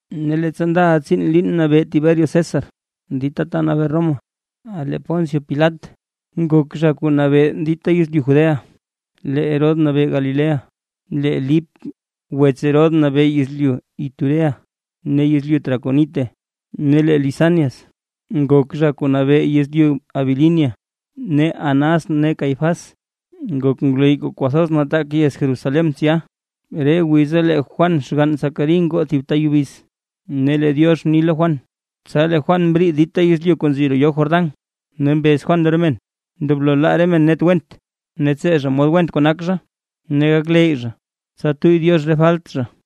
Ne leettsa ndaʼa tsiin liin nabee Tiberio César dita ta nabee Roma, lee Poncio Pilat nak zha kuu nabee yezlyu Judea, lee Herodes nabee Galilea, lee Lip wets Herodes nabee yezlyu Iturea ne yezlyu Traconite, ne lee Lisanias nak zha kuu nabee yezlyu Abilinia. Ne Anás ne Cáifas nak ngwleyy kuu kwathoz nataak yez Jerusalén tsya. Re wiza lee Juan xgann Zacarí ngoo thib ta yubiz, ne lee Diox mni lo Juan. Tsa lee Juan mriid dita yezlyu kuu nzi roo yoo Jordán, ne mbez Juan lo re men, ndoblo laa re men net went ne tsee zha mod went kuu nak zha, ne gakleyy zha, tsa tuyy Diox re falt zha.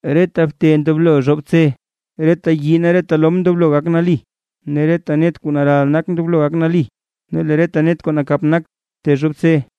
Reta bte ndoblo zhobtse, ne reta yii ne reta lom ndoblo gak nali, ne reta net kuu naral nak ndoblo gak nali, ne lee re net kuu nakap nak tezhobtse,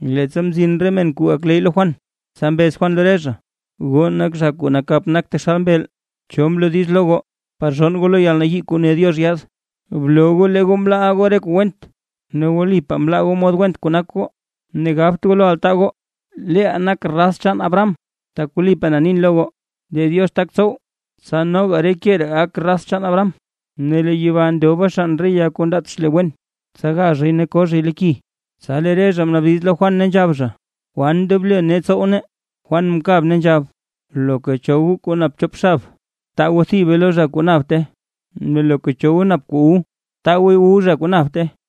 Leettsa mzin re men kuu gakleyy lo Juan, tsa mbez Juan lo re zha: ―¡Goo nak zha kuu nakap nak taxal mbeel! ¿Cho mloo diiz lo goo par zhonn goo lo yalnayii kuu ne Diox yaad? Bloo goo lee goo mlaaʼa goo re kuu went ne wlipaa mlaa goo mod went kuu nak goo, ne gabt goo lo altaa goo: “¡Leeʼaa nak raz chaan Abraham!” Tak wlipaa na nin lo goo, lee Diox tak tsow, tsa noga re ke ree gak raz chaan Abraham. Ne lee yeba ndoba xann re ya kuu ndaat xle wen, tsa ga zhay ne ko zhay lo ki. Tsa lee re zha mnaabdiz lo Juan, ne nzhab zha: ―¿Kwan ndoblo nee tsow nee? Juan mkab ne nzhab: ―Loka cho goo kuu nap chop xab, btaa goo thibe lo zha kuu napte, ne loka cho goo nap kuu wu, btaa gooy wu zha kuu napte.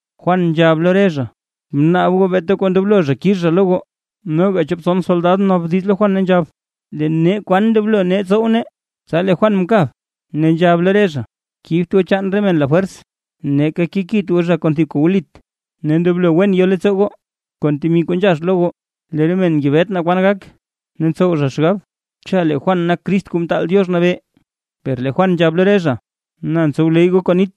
Juan nzhab lo re zha: ―Bnaab goo beeta kuu ndoblo zha kix zha lo goo. Noga chop tson soldad mnaabdiz lo Juan, ne nzhab: ―¿Lee nee kwan ndoblo nee tsow nee? Tsa lee Juan mkab, ne nzhab lo re zha: ―Kibt goo chaan re men lafwers, neeka kekit goo zha kon thib kuu wlit, ne ndoblo wen yo leettsoo goo kon temi kuu nzhax lo goo. Lee re men ngebet naa kwan gak. Ne ntsow zha xgab cha lee Juan nak Crist Kuu Mtaal Diox Nabee. Per lee Juan nzhab lo re zha: ―Na, ntsowleyy goo kon nit,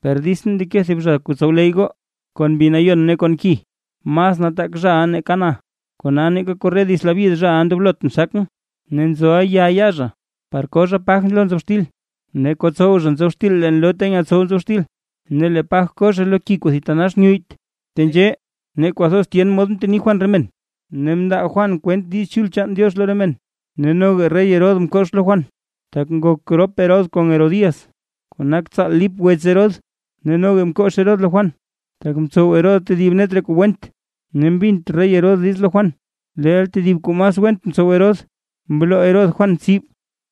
per ditsʼn ndeke tedib zha kuu tsowleyy goo kon Mbi Nayon ne kon ki. Mas nataak zhaʼa nake na, kona neeka korre dits labyid zhaʼa ndoblotʼn xakʼn. Ne nzoʼa ya yaa zha par koo zha paj lo nzob xtil, ne kotsow zha nzob xtil leen loo ta nyetsow nzob xtil, ne lee paj ko zha lo ki kuu thitanax nyuyyt. Tenzhee, ne kwathoz tyen mod mteni Juan re men, ne mndaa Juan kwent Diiz Chul chaan Diox lo re men. Ne noga rey Herodes mkox lo Juan, tak ngok rop Herodes kon Herodías kuu nak tsaal Lip wets Herodes, ne noga mkox Herodes lo Juan, tak mtsow Herodes tedib net re kuu went, ne mbint rey Herodes diiz lo Juan, leel tedib kuu mas went mtsow Herodes, mloo Herodes Juan tsib.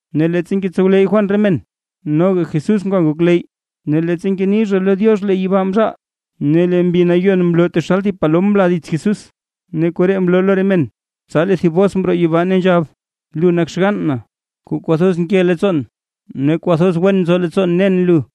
Ne leettsa ngetsowleyy Juan re men, noga Jesús ngwa ngokleyy, ne leettsa ngeni zha lo Diox lee yibaa mzhaal, ne lee Mbi Nayon mloo taxal thib palom mla dits Jesús, ne koree mloo lo re men, tsa lee thib bos mroo yibaa ne nzhab: ―Lu nak xgann na, kuu kwathoz nke leettsoon ne kwathoz wen nzo leettsoon nen lu.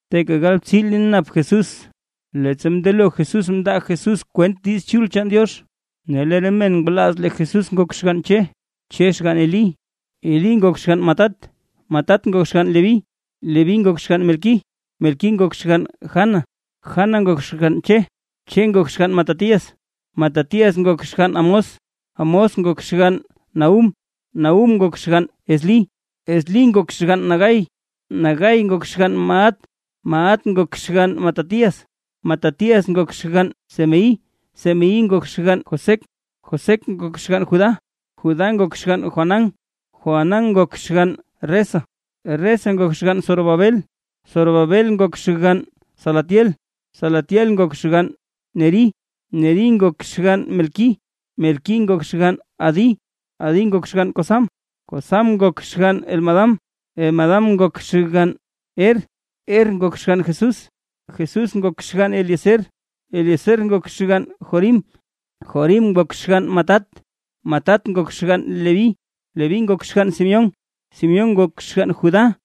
Teeka galbtsii liin nap Jesús leettsa mndelo Jesús mndaa Jesús kwent Diiz Chul chaan Diox. Ne lee re men ngwalaaz lee Jesús nak xgann Che, Che xgann Elí, Elí ngok xgann Matat, Matat ngok xgann Leví, Leví ngok xgann Melquí, Melquí ngok xgann Jana, Jana ngok xgann Che, Che ngok xgann Matatías, Matatías ngok xgann Amós, Amós ngok xgann Nahúm, Nahúm ngok xgann Eslí, Eslí ngok xgann Nagai, Nagai ngok xgann Maat, Maat ngok xgann Matatías, Matatías ngok xgann Semeí, Semeí ngok xgann Josec, Josec ngok xgann Judá, Judá ngok xgann Joanán, Joanán ngok xgann Resa, Resa ngok xgann Zorobabel, Zorobabel ngok xgann Salatiel, Salatiel ngok xgann Nerí, Nerí ngok xgann Melquí, Melquí ngok xgann Adí, Adí ngok xgann Cosam, Cosam ngok xgann Elmadam, Elmadam ngok xgann Er, Er ngok xgann Jesús, Jesús ngok xgann Eliezer, Eliezer ngok xgann Jorim, Jorim ngok xgann Matat, Matat ngok xgann Leví, Leví ngok xgann Simeón, Simeón ngok xgann Judá,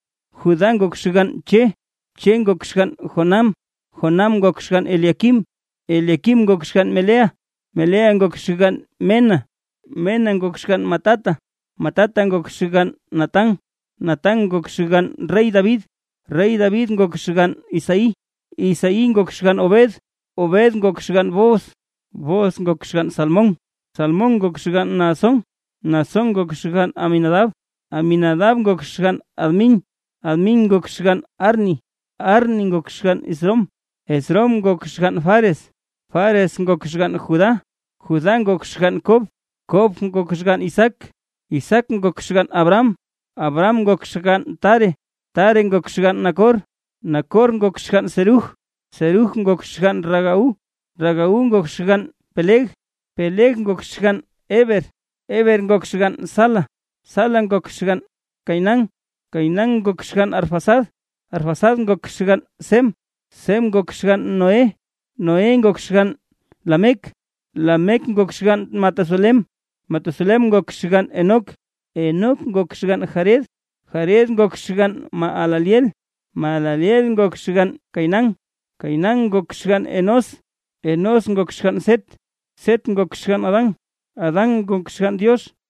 Judá ngok xgann Che, Che ngok xgann Jonám, Jonám ngok xgann Eliaquim, Eliaquim ngok xgann Meleá, Meleá ngok xgann Mena, Mena ngok xgann Matatá, Matatá ngok xgann Natán, Natán ngok xgann rey David, rey David ngok xgann Isaí, Isaí ngok xgann Obed, Obed ngok xgann Booz, Booz ngok xgann Salmón, Salmón ngok xgann Naasón, Naasón ngok xgann Aminadab, Aminadab ngok xgann Admín, Admín ngok xgann Arní, Arní ngok xgann Esrom, Esrom ngok xgann Fares, Fares ngok xgann Judá, Judá ngok xgann Kob, Kob ngok xgann Isaac, Isaac ngok xgann Abraham, Abraham ngok xgann Taré, Taré ngok xgann Nacor, Nacor ngok xgann Serug, Serug ngok xgann Ragau, Ragau ngok xgann Péleg, Péleg ngok xgann Heber, Heber ngok xgann Sala, Sala ngok xgann Cainán, Cainán ngok xgann Arfaxad, Arfaxad ngok xgann Sem, Sem ngok xgann Noé, Noé ngok xgann Lamec, Lamec ngok xgann Matusalén, Matusalén ngok xgann Enoc, Enoc ngok xgann Járed, Járed ngok xgann Mahalaleel, Mahalaleel ngok xgann Cainán, Cainán ngok xgann Enós, Enós ngok xgann Set, Set ngok xgann Adán, Adán ngok xgann Diox.